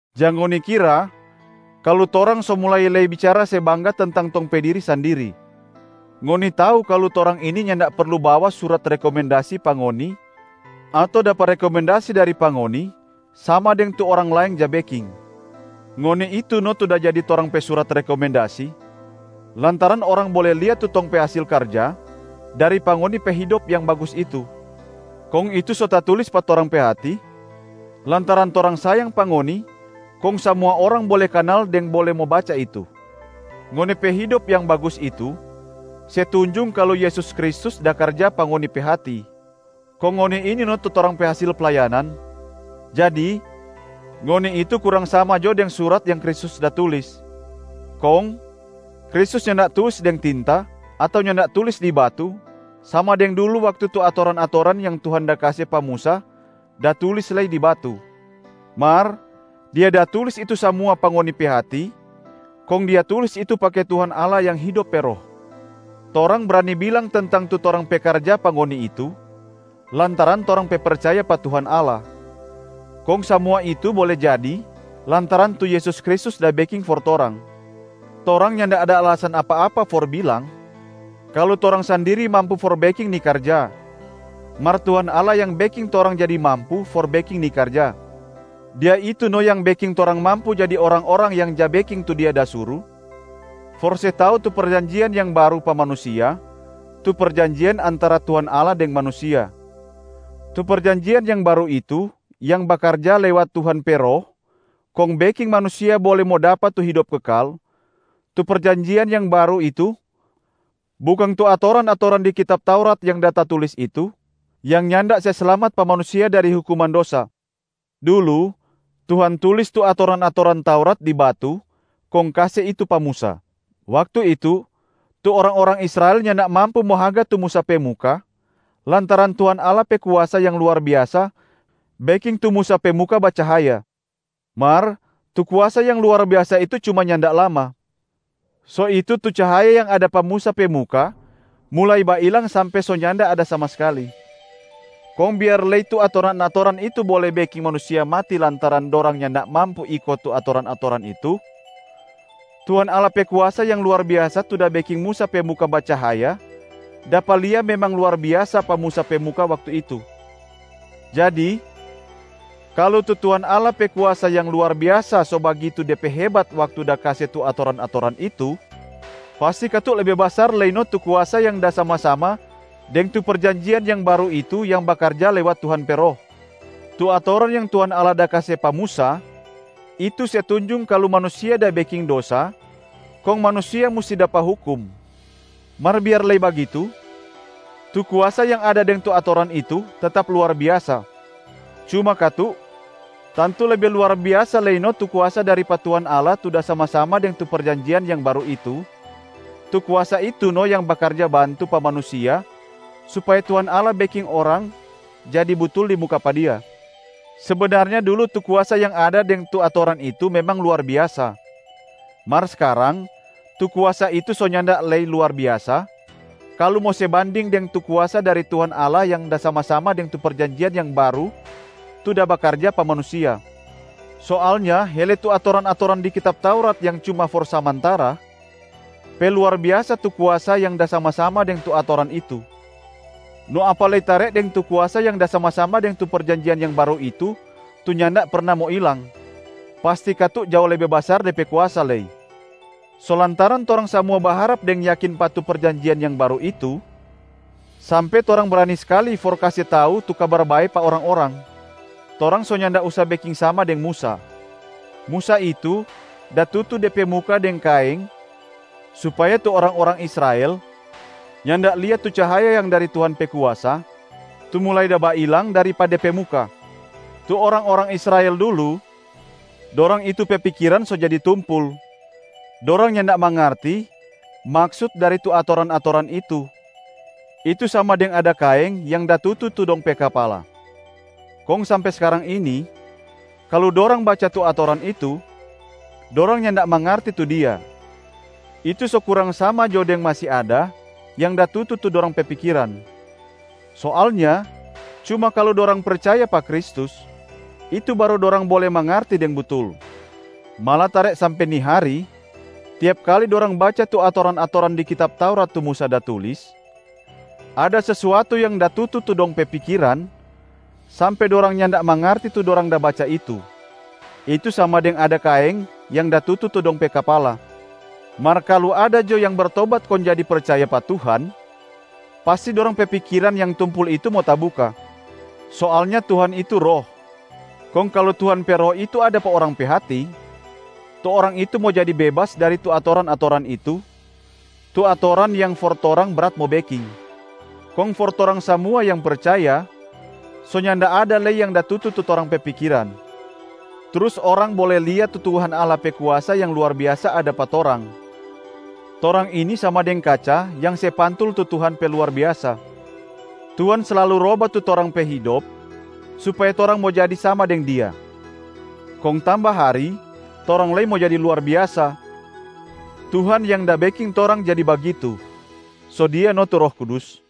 Jang ngoni kira kalu torang so mulai lei bicara se bangga tentang tong pe diri sandiri. Ngoni tau kalu torang ini nyanda perlu bawa surat rekomendasi pa ngoni ato dapa rekomendasi dari pa ngoni sama deng tu orang laeng ja beking. Ngoni itu no tu da jadi torang pe surat rekomendasi, lantaran orang bole lia tu tong pe hasil karja dari pa ngoni pe hidop yang bagus itu. Kong itu so tatulis pa torang pe hati lantaran torang sayang pa ngoni kong samua orang bole kanal deng bole mo baca itu. Ngoni pe hidop yang bagus itu se tunjung kalu Yesus Kristus da karja pa ngoni pe hati, kong ngoni ini no tu torang pe hasil playanan. Jadi ngoni itu kurang sama jo deng surat yang Kristus da tulis. Kong Kristus nyanda tulis deng tinta ato nyanda da tulis di batu sama deng dulu waktu tu atoran-atoran yang Tuhan da kase pa Musa da tulis lei di batu, mar Dia da tulis itu samua pa ngoni pe hati kong Dia tulis itu pake Tuhan Allah yang Hidop pe Roh. Torang brani bilang tentang tu torang pe karja pa ngoni itu lantaran torang pe percaya pa Tuhan Allah, kong samua itu bole jadi lantaran tu Yesus Kristus da beking for torang. Torang nyanda ada alasan apa-apa for bilang kalu torang sandiri mampu for beking ni karja, mar Tuhan Allah yang beking torang jadi mampu for beking ni karja. Dia itu no yang beking torang mampu jadi orang-orang yang ja beking tu Dia da suru for se tau tu perjanjian yang baru pa manusia, tu perjanjian antara Tuhan Allah deng manusia. Tu perjanjian yang baru itu yang bakarja lewat Tuhan pe Roh kong beking manusia bole mo dapa tu hidop kekal, tu perjanjian yang baru itu bukang tu atoran-atoran di kitab Taurat yang da tatulis itu yang nyanda se slamat pa manusia dari hukuman dosa. Dulu Tuhan tulis tu atoran-atoran Taurat di batu kong kase itu pa Musa. Waktu itu, tu orang-orang Israel nyanda mampu mo haga tu Musa pe muka, lantaran Tuhan Allah pe kuasa yang luar biasa beking tu Musa pe muka bacahaya. Mar tu kuasa yang luar biasa itu cuma nyanda lama, so itu tu cahaya yang ada pa Musa pe muka mulai bailang sampe so nyanda ada sama skali. Kong biar lei tu atoran-atoran itu bole beking manusia mati lantaran dorang nyanda mampu iko tu atoran-atoran itu, Tuhan Allah pe kuasa yang luar biasa tu da beking Musa pe muka bacahaya dapa lia memang luar biasa pa Musa pe muka waktu itu. Jadi kalu tu Tuhan Allah pe kuasa yang luar biasa so bagitu de pe hebat waktu da kase tu atoran-atoran itu, pasti katu lebe basar lei no tu kuasa yang da sama-sama deng tu perjanjian yang baru itu yang bakarja lewat Tuhan pe Roh. Tu atoran yang Tuhan Allah da kase pa Musa itu se tunjung kalu manusia da beking dosa kong manusia musti dapa hukum, mar biar lei bagitu tu kuasa yang ada deng tu atoran itu tetap luar biasa. Cuma katu, tantu lebe luar biasa lei no tu kuasa dari pa Tuhan Allah tu da sama-sama deng tu perjanjian yang baru itu, tu kuasa itu no yang bakarja bantu pa manusia supaya Tuhan Allah beking orang jadi butul di muka pa Dia. Sebenarnya dulu tu kuasa yang ada deng tu atoran itu memang luar biasa, mar skarang tu kuasa itu so nyanda lei luar biasa kalu mo se banding deng tu kuasa dari Tuhan Allah yang da sama-sama deng tu perjanjian yang baru tu da bakarja pa manusia. Soalnya hele tu atoran-atoran di kitab Taurat yang cuma for samantara, pe luar biasa tu kuasa yang da sama-sama deng tu atoran itu. No apa lei tare deng tu kuasa yang da sama-sama deng tu perjanjian yang baru itu tu nyanda perna mo ilang, pasti katu jao lebe basar de pe kuasa lei. So lantaran torang samua baharap deng yakin pa tu perjanjian yang baru itu sampe torang brani skali for kase tau tu Kabar Bae pa orang-orang. Torang so nyanda usa beking sama deng Musa. Musa itu da tutu de pe muka deng kaeng supaya tu orang-orang Israel nyanda lia tu cahaya yang dari Tuhan pe kuasa tu mulai da bailang dari pa de pe muka. Tu orang-orang Israel dulu, dorang itu pe pikiran so jadi tumpul, dorang nyanda mangarti maksut dari tu atoran-atoran itu, itu sama deng ada kaeng yang da tutu tu dong pe kapala. Kong sampe skarang ini, kalu dorang baca tu atoran itu, dorang nyanda mangarti tu dia, itu so kurang sama jo deng masi ada yang da tutu tu dong pe pikiran. Soalnya cuma kalu dorang percaya pa Kristus, itu baru dorang bole mangarti deng butul. Malatare sampe ni hari, tiap kali dorang baca tu atoran-atoran di kitab Taurat tu Musa da tulis, ada sesuatu yang da tutu tu dong pe pikiran sampe dorang nyanda mangarti tu dorang da baca itu, itu sama deng ada kaeng yang da tutu tu dong pe kapala. Mar kalu ada jo yang bertobat kong jadi percaya pa Tuhan, pasti dorang pe pikiran yang tumpul itu mo tabuka. Soalnya Tuhan itu Roh. Kong kalu Tuhan pe Roh itu ada pa orang pe hati, tu orang itu mo jadi bebas dari tu atoran-atoran itu, tu atoran yang for torang brat mo beking. Kong for torang samua yang percaya, so nyanda ada lei yang da tutu tu torang pe pikiran. Trus orang bole lia tu Tuhan Allah pe kuasa yang luar biasa ada pa torang, torang ini sama deng kaca yang se pantul tu Tuhan pe luar biasa. Tuhan slalu roba tu torang pe hidop supaya torang mo jadi sama deng Dia, kong tamba hari torang lei mo jadi luar biasa. Tuhan yang da beking torang jadi bagitu, so Dia no tu Roh Kudus.